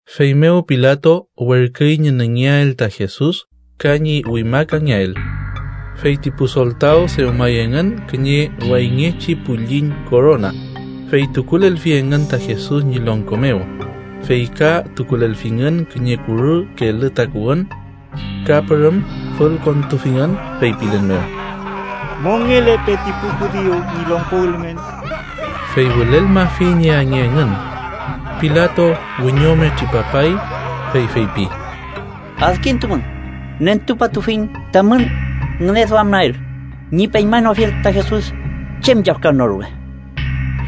Feymew Pilato werküy ñi nüngeael ta Jesus ka ñi wimakangeael. Fey ti pu soltaw dewmay engün kiñe wayngechi pülliñ korona, fey tukulelfi engün ta Jesus ñi longko mew, fey ka tukulelfingün kiñe kurü kelü takuwün. Ka pürüm fülkontufingün, feypilen mew: —¡Mongelepe ti pu judiu ñi longko ülmen! Fey wülelmafi ñi ange engün. Pilato wiñome tripapay, fey feypi: —Adkintumün, nentupatufiñ tamün ngüneduamael ñi peñmanoafiel ta Jesus chem yafkan no rume.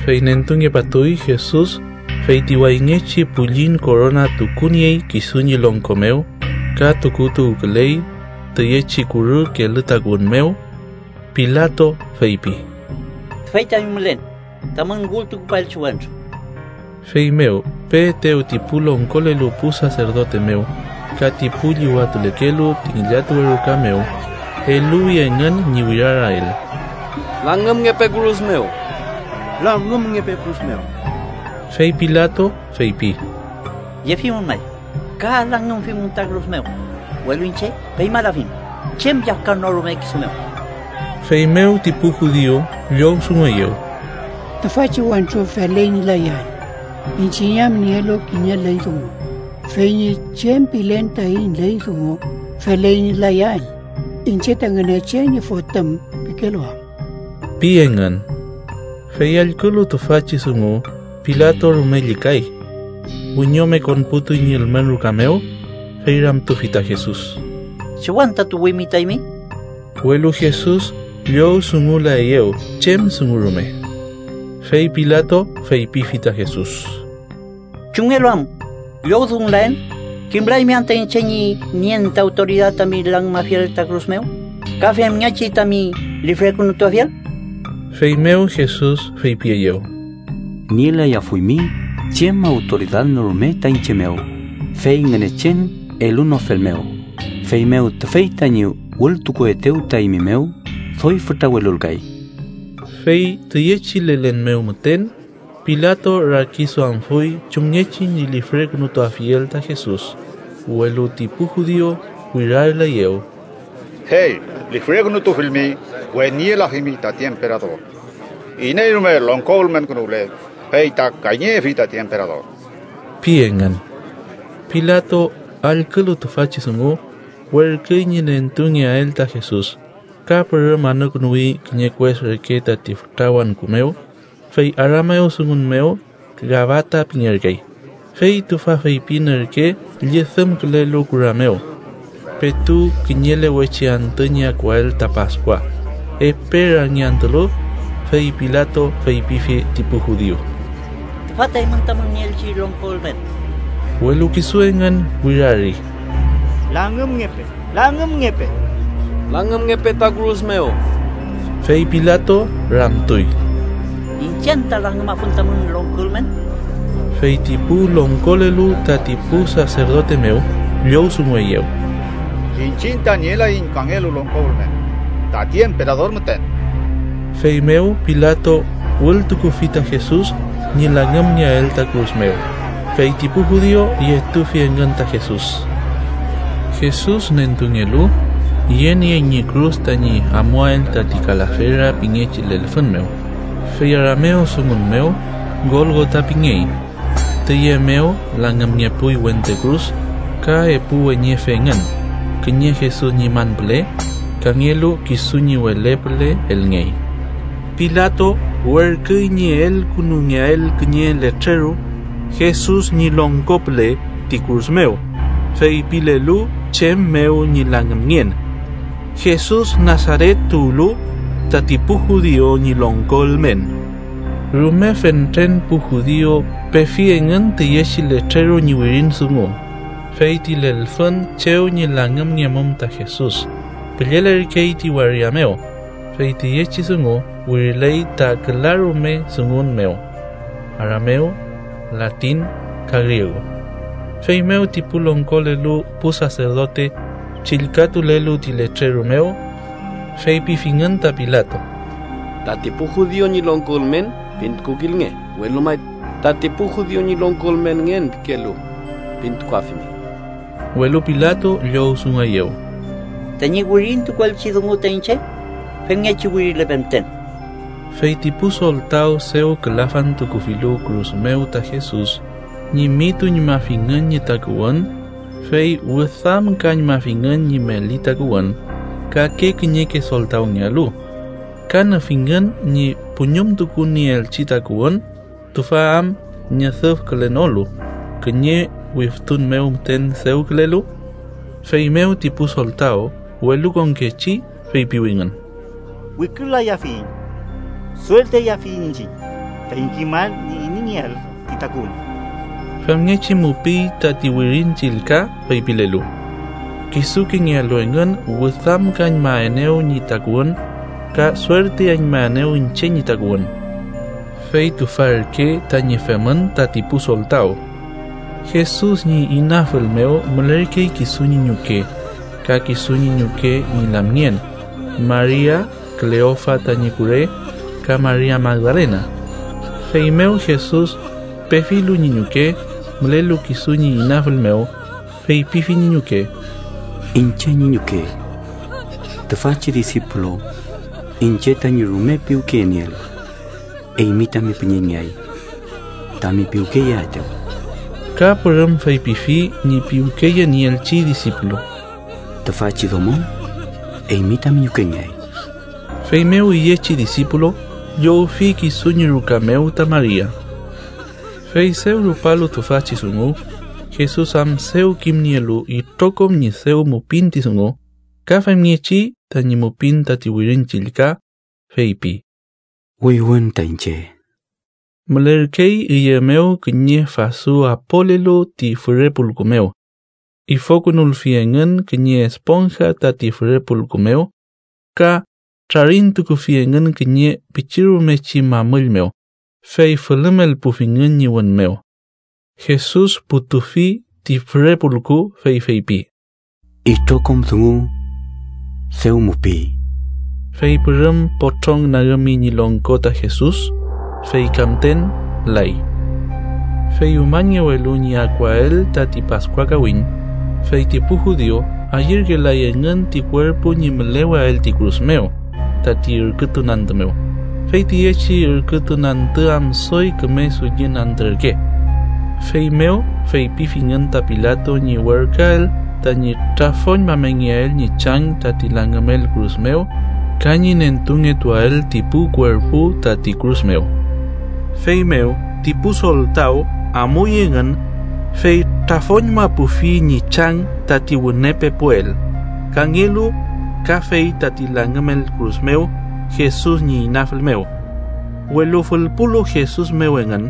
Fey nentungepatuy Jesus fey ti wayngechi pülliñ korona tukuniey kisu ñi longko mew ka tukutuwküley tüyechi kurü kelü takuwün mew. Pilato feypi: —¡Tüfey tañi mülen tamün wültukupaelchi wentru! Feymew peetew ti pu longkolelu pu saserdote mew ka ti pu llüwatulekelu ti ngillatuwe ruka mew, eluwi engün ñi wirarael: —¡Langümngepe kürus mew! ¡Langümngepe kürus mew! Fey Pilato feypi: —Yefimün may ka langümfimün ta kürus mew, welu iñche peñmalafiñ chem yafkan no rume kisu mew. Feymew ti pu judiu llowdungueyew: —Tüfachi wentru feley ñi layael, iñchiñ am nielu kiñe ley dungu, fey ñi chem pilen taiñ ley dungu feley ñi layael, ‘iñche ta Ngünechen ñi Fotüm’ pikelu am ―pi engün. Fey allkülu tüfachi dungu, Pilato rume llükay. Wiñome konputuy ñi ülmen ruka mew, fey ramtufi ta Jesus: —¿Chew anta tuwimi ta eymi? Welu Jesus llowdungulaeyew chem dungu rume. Fey Pilato feypifi ta Jesus: —¿Chumngelu am llowdungulaen? ¿Kimlaymi anta iñche ñi nien ta awtoridad tami langümafiel ta kürus mew ka femngechi tami lifrekünutuafiel? Feymew Jesus feypieyew: —Nielayafuymi chem awtoridad no rume ta iñche mew, fey Ngünechen elunofelmew, feymew tüfey tañi wültukuetew ta eymi mew doy fütra welulkay. Fey tüyechi lelen mew müten, Pilato rakiduamfuy chumngechi ñi lifrekünutuafiel ta Jesus, welu ti pu judiu wirareleyew: —¡Fey lifrekünutufilmi, weniyelafimi tati emperador! ¡Iney rume longko ülmenkünuwle, fey ta kayñeyefi tati emperador! ―pi engün. Pilato allkülu tüfachi dungu, werküy ñi nentungeael ta Jesus, ka pürüm anükünuwi kiñe kues reke tati fütra wangku mew, (fey aramewdungun mew Gabata pingerkey), fey tüfa feypin ürke llüdümkülelu kura mew. Petu kiñelewechi antü ñi akuael ta Paskua, epe rangiantülu, fey Pilato feypifi ti pu judiu: —¡Tüfa ta eymün tamün nieelchi longko ülmen! Welu kisu engün wirari: —¡Langümngepe! ¡Langümngepe! ¡Langümngepe ta kürus mew! Fey Pilato ramtuy: —¿Iñche anta langümafun tamün longko ülmen? Fey ti pu longkolelu tati pu saserdote mew llowdungueyew: —¡Iñchiñ ta nielaiñ kangelu longko ülmen, tati emperador müten! Feymew Pilato wültukufi ta Jesus ñi langümngeael ta kürus mew, fey ti pu judiu yetufi engün ta Jesus. Jesus nentungelu, yeniey ñi kürus tañi amuael tati Kalafera pingechi lelfün mew (fey aramewdungun mew Golgota pingey). Tüye mew langümngepuy wente kürus ka epu weñefe engün, kiñe Jesus ñi man püle, kangelu kisu ñi wele püle elngey. Pilato werküy ñi elkünulngeael kiñe letreru Jesus ñi longko püle ti kürus mew, feypilelu chem mew ñi langümngen: JESUS NASARET TUWLU, TATI PU JUDIU ÑI LONGKO ÜLMEN. Rume fentren pu judiu pefi engün tüyechi letreru ñi wirin dungu, fey ti lelfün chew ñi langümngemum ta Jesus püllelerkey ti waria mew, fey tüyechi dungu wiriley ta külarume dungun mew: aramew, latin ka griegu. Feymew ti pu longkolelu pu saserdote chillkatulelu ti letreru mew, feypifingün ta Pilato: —‘Tati pu judiu ñi longko ülmen’ pintukukilnge, welu may ‘Tati pu judiu ñi longko ülmenngen pikelu’ pintukuafimi. Welu Pilato llowdungueyew: —Tañi wirintukuelchi dungu ta iñche, femngechi wirilepe müten. Feyti pu soltaw dew külafantukufilu kürus mew ta Jesus, ñimituñmafingün ñi takuwün, fey wüdamkañmafingün ñi meli takuwün, kake kiñeke soltawngealu. Ka nüfingün ñi puñumtukunieelchi takuwün, tüfa am ñüdüfkülenolu, kiñe wiftun mew müten dewkülelu. Feymew ti pu soltaw welukonkechi feypiwingün: —Wikürlayafiyiñ. Suertiayafiyiñ iñchiñ taiñ kimael ñi ineyngeael ti takuwün. Famngechi mupiy tati Wirin Chillka feypilelu: “Kisukengealu engün wüdamkañmaenew ñi takuwün, ka suertiañmaenew iñche ñi takuwün.” Fey tüfa ürke tañi femün tati pu soltaw. Jesus ñi inafül mew mülerkey kisu ñi ñuke, ka kisu ñi ñuke ñi lamngen, Maria, Kleofa tañi kure, ka Maria Magdalena. Feymew Jesus pefilu ñi ñuke, mülelu kisu ñi inafül mew, feypifi ñi ñuke: —Iñche ñi ñuke, tüfachi disipulu iñche tañi rume piwkeyenieel, eymi tami püñeñngeay tami piwkeyeaetew. Ka pürüm feypifi ñi piwkeyenieelchi disipulu: —Tüfachi domo eymi tami ñukengeay. Feymew, üyechi disipulu llowfi kisu ñi ruka mew ta Maria. Fey dew rupalu tüfachi dungu, Jesus am dew kimnielu itrokom ñi dew mupin ti dungu, ka femngechi tañi mupin tati Wirin Chillka, feypi: —“Wüywün ta iñche.” Mülerkey üye mew kiñe fasu apolelu ti füre pulku mew. Ifokünulfi engün kiñe esponja tati füre pulku mew ka trarintukufi engün kiñe pichirumechi mamüll mew, fey fülümelpufingün ñi wün mew. Jesus putufi ti füre pulku, fey feypi: —Itrokom dungu dew mupiy. Fey pürüm potrong nagümi ñi longko ta Jesus, fey ka müten lay. Fey umañngewelu ñi akuael tati Paskua kawiñ, fey ti pu judiu ayürkelay engün ti kuerpu ñi müleweael ti kürus mew tati ürkütun antü mew, fey tüyechi ürkütun antü am doy küme dullin antü ürke. Feymew feypifingün ta Pilato ñi werküael tañi trafoñmamengeael ñi chang tati langümel kürus mew ka ñi nentungetuael ti pu kuerpu tati kürus mew. Feymew ti pu soltaw amuy engün, fey trafoñmapufi ñi chang tati wüne pepuel, kangelu kafey tati langümel kürus mew Jesus ñi inafül mew. Welu fülpulu Jesus mew engün,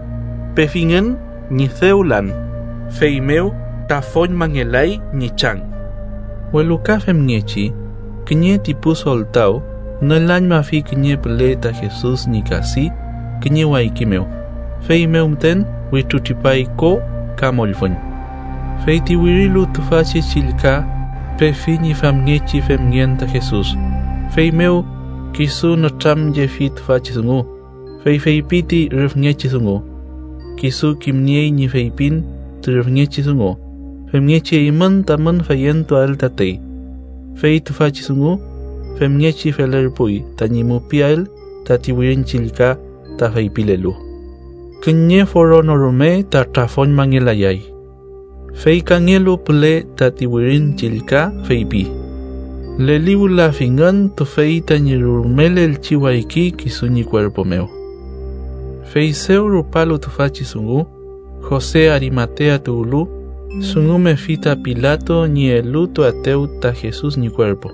pefingün ñi dew lan. Feymew trafoñmangelay ñi chang. Welu ka femngechi, kiñe ti pu soltaw nülañmafi kiñe püle ta Jesus ñi kadi kiñe wayki mew, feymew müten wütrutripay ko ka mollfüñ. Fey ti wirilu tüfachi chillka pefi ñi famngechi femngen ta Jesus, feymew kisu nütramyefi tüfachi dungu, fey feypi ti rüfngechi dungu. Kisu kimniey ñi feypin ti rüfngechi dungu, femngechi eymün tamün feyentuael tatey. Fey tüfachi dungu femngechi felerpuy tañi mupiael tati Wirin Chillka ta feypilelu: “Kiñe foro no rume ta trafoñmangelayay.” Fey kangelu püle tati Wirin Chillka feypi: “Leliwülafingün tüfey tañi rulmelelchi wayki kisu ñi kuerpu mew.” Fey dew rupalu tüfachi dungu, Jose Arimatea tuwlu, dungumefi ta Pilato ñi elutuaetew ta Jesus ñi kuerpu.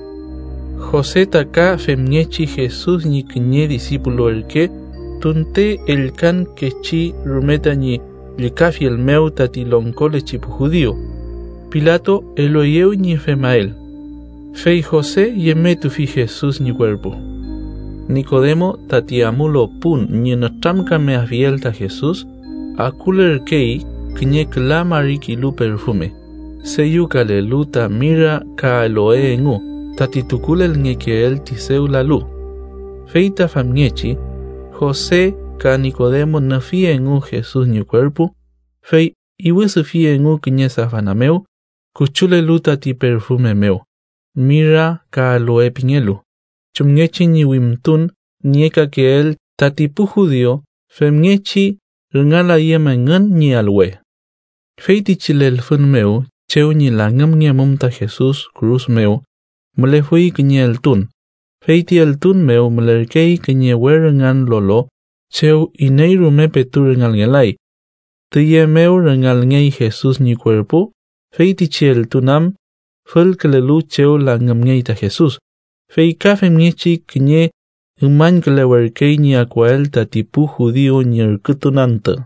Jose ta ka femngechi Jesus ñi kiñe disipulu ürke tunte ellkankechi rume tañi llükafiel mew tati longkolechi pu judiu. Pilato elueyew ñi femael, fey Jose yemetufi Jesus ñi kuerpu. Nikodemo, tati amulu pun ñi nütramkameafiel ta Jesus, akulürkey kiñe küla mari kilu perfume, deyükalelu ta mira ka aloe engu tati tukulelngekeel ti dew lalu. Fey ta famngechi, Jose ka Nikodemo nüfi engu Jesus ñi kuerpu fey iwüdüfi engu kiñe safana mew küchulelu tati perfume mew, mira ka aloe pingelu, chumngechi ñi wimtun niekakeel tati pu judiu femngechi rüngalayüm engün ñi alwe. Feytichi lelfün mew chew ñi langümngemum ta Jesus kürus mew mülefuy kiñe eltun, fey ti eltun mew mülerkey kiñe we rüngan lolo chew iney rume petu rüngalngelay. Tüye mew rüngalngey Jesus ñi kuerpu feytichi eltun am fülkülelu chew langümngey ta Jesus, fey ka femngechi kiñe umañkülewerkey ñi akuael tati pu judiu ñi ürkütun antü.